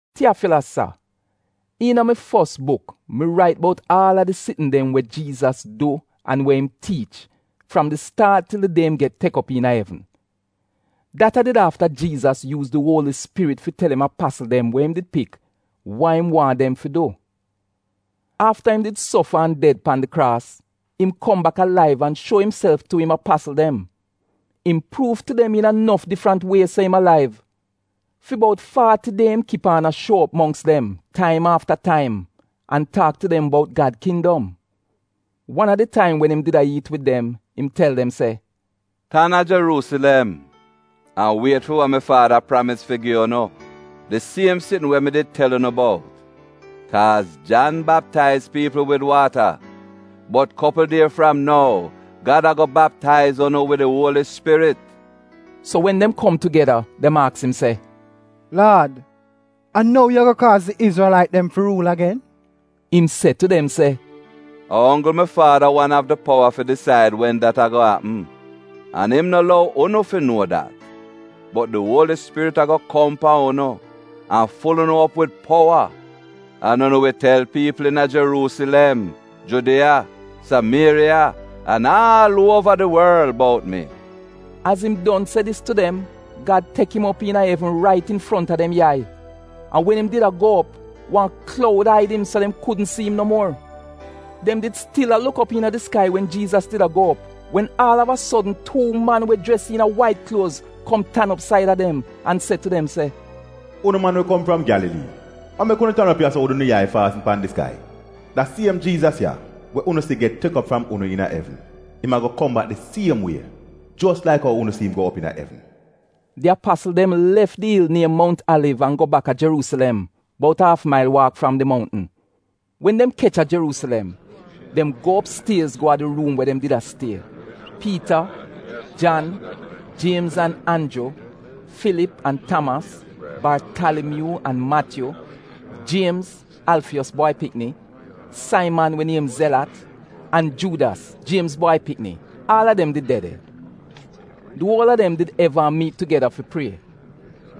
Tiyafilas sa, iina mi fos buk mi rait bout aal a di sitn dem we Jiizas du an we im tiich fram di staat til di die im get tek op iina evn. Dat a did afta Jiizas yuuz di Uoli Spirit fi tel im apasl dem we im did pik, wa im waahn dem fi du. Afta im did sofa an ded pan di kraas, im kom bak alaiv an shuo imself tu im apasl dem. Im pruuv tu dem iina nof difrant wie se im alaiv. Fi bout faati die im kip aan a shuo op mongks dem taim afta taim an taak tu dem bout Gad kindom. Wan a di taim wen im did a iit wid dem im tel dem se, “Tan a Jeruusilem an wiet fi wa mi Faada pramis fi gi unu, di siem sitn we mi did tel unu bout. Kaaz Jan baptaiz piipl wid waata, bot kopl die fram nou Gad a-go baptaiz unu wid di Uoli Spirit.” So wen dem kom tugeda, dem aks im se, “Laad, a nou yu a-go kaaz di Izrelait dem fi ruul agen?” Im se tu dem se, “A onggl mi Faada wan av di powa fi disaid wen dat a-go apm. An im no lou unu fi nuo dat. Bot di Uoli Spirit a-go kom pan unu an ful unu op wid powa an unu wi tel piipl iina Jeruusilem, Judiya, Samieriya an aal uova di worl bout mi.” Az im don se dis tu dem, Gad tek im op iina evn rait infronta dem yai, an wen im did a go op, wan kloud aid im so dem kudn si im no muor. Dem did stil a luk iina di skai wen Jiizas did a go op, wen aal av a sodn tuu man we jres iina wait kluoz kom tan op saida dem an se tu dem se, “Unu man we kom fram Gyalalii, wa mek unu tan op ya-so wid unu yai faasn pan di skai? Da siem Jiizas ya we unu si get tek op fram unu iina evn, im a-go kom bak di siem wie, jos laik ou unu si im go op iina evn.” Di apasl dem lef di il niem Mount Aliv an go baka Jeruusilem, bout aaf mail waak fram di mountn. Wen dem kech a Jeruusilem, dem go opstiez go a di ruum we dem did a stie. Piita, Jan, Jiemz an Anju; Filip an Tamas, Bartalimyuu an Matyu; Jiemz, Alfiyos bwai pikni, Saiman we niem Zelat, an Juudas, Jiemz bwai pikni, aal a dem did de de. Di uol a dem did eva a miit tugeda fi prie: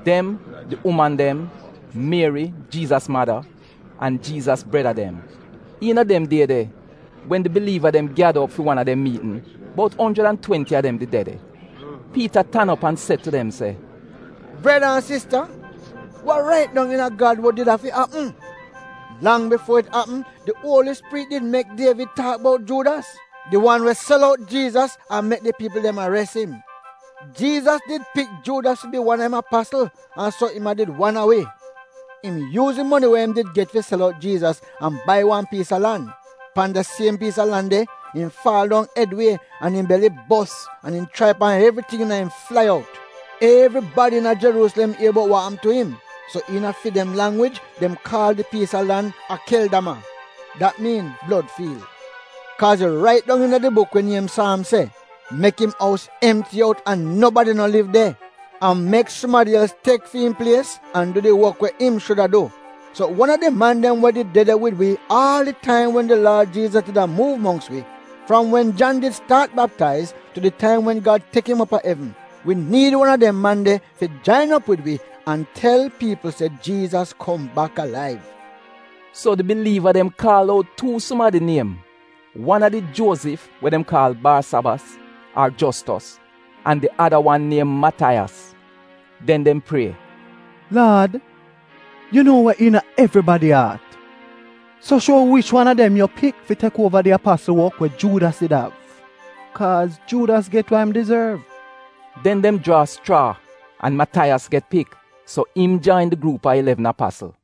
dem, di uman dem, Mieri, Jiizas mada, an Jiizas breda dem. Iina dem die de, wen di biliiva dem gyada op fi wan a dem miitn, (bout onjrid an twenti a dem did de de), Piita tan op an se tu dem se, “Breda an sista, wa rait dong iina Gad wod did afi apm. Lang bifuo it apm, di Uoli Spirit did mek Dievid taak bout Juudas, di wan we sel out Jiizas an mek di piipl dem ares im. Jiizas did pik Juudas fi bi wan a im apasl an so im a did wan a wi.” (Im yuuz di moni we im did get fi sel out Jiizas an bai wan piis a lan. Pan da siem piis a lan de, im faal dong ed wie an im beli bos an im chraip an evriting iina im flai out. Evribadi iina Jeruusilem ier bout wa apm tu im, so iina fi dem langwij dem kaal di piis a lan Akeldama, dat miin blod fiil.) “Kaaz it rait dong iina di buk we niem Saamz se, “‘Mek im ous emti out an nobadi no liv de,’ an, “‘Mek sumadi els tek fi'im plies an du di wok we im shuda du.’ So wan a di man dem we did de de wid wi aal di taim wen di Laad Jiizas did a muuv mongks wi, fram wen Jan did staat baptaiz tu di taim wen Gad tek im op a evn, wi niid wan a dem man de fi jain op wid wi an tel piipl se Jiizas kom bak alaiv.” So di biliiva dem kaal out tuu sumadi niem, wan a did Juozif we dem kaal Baasabas ar Jostos, an di ada wan niem Mataiyas. Den dem prie, “Laad, yu nuo wa iina evribadi aat. So shuo wi wich wan a dem yu pik fi tek uova di apasl wok we Juudas did av. Kaaz Juudas get wa im dizorv.” Den dem jraa schraa an Mataiyas get pik, so im jain di gruup a ilevn apasl.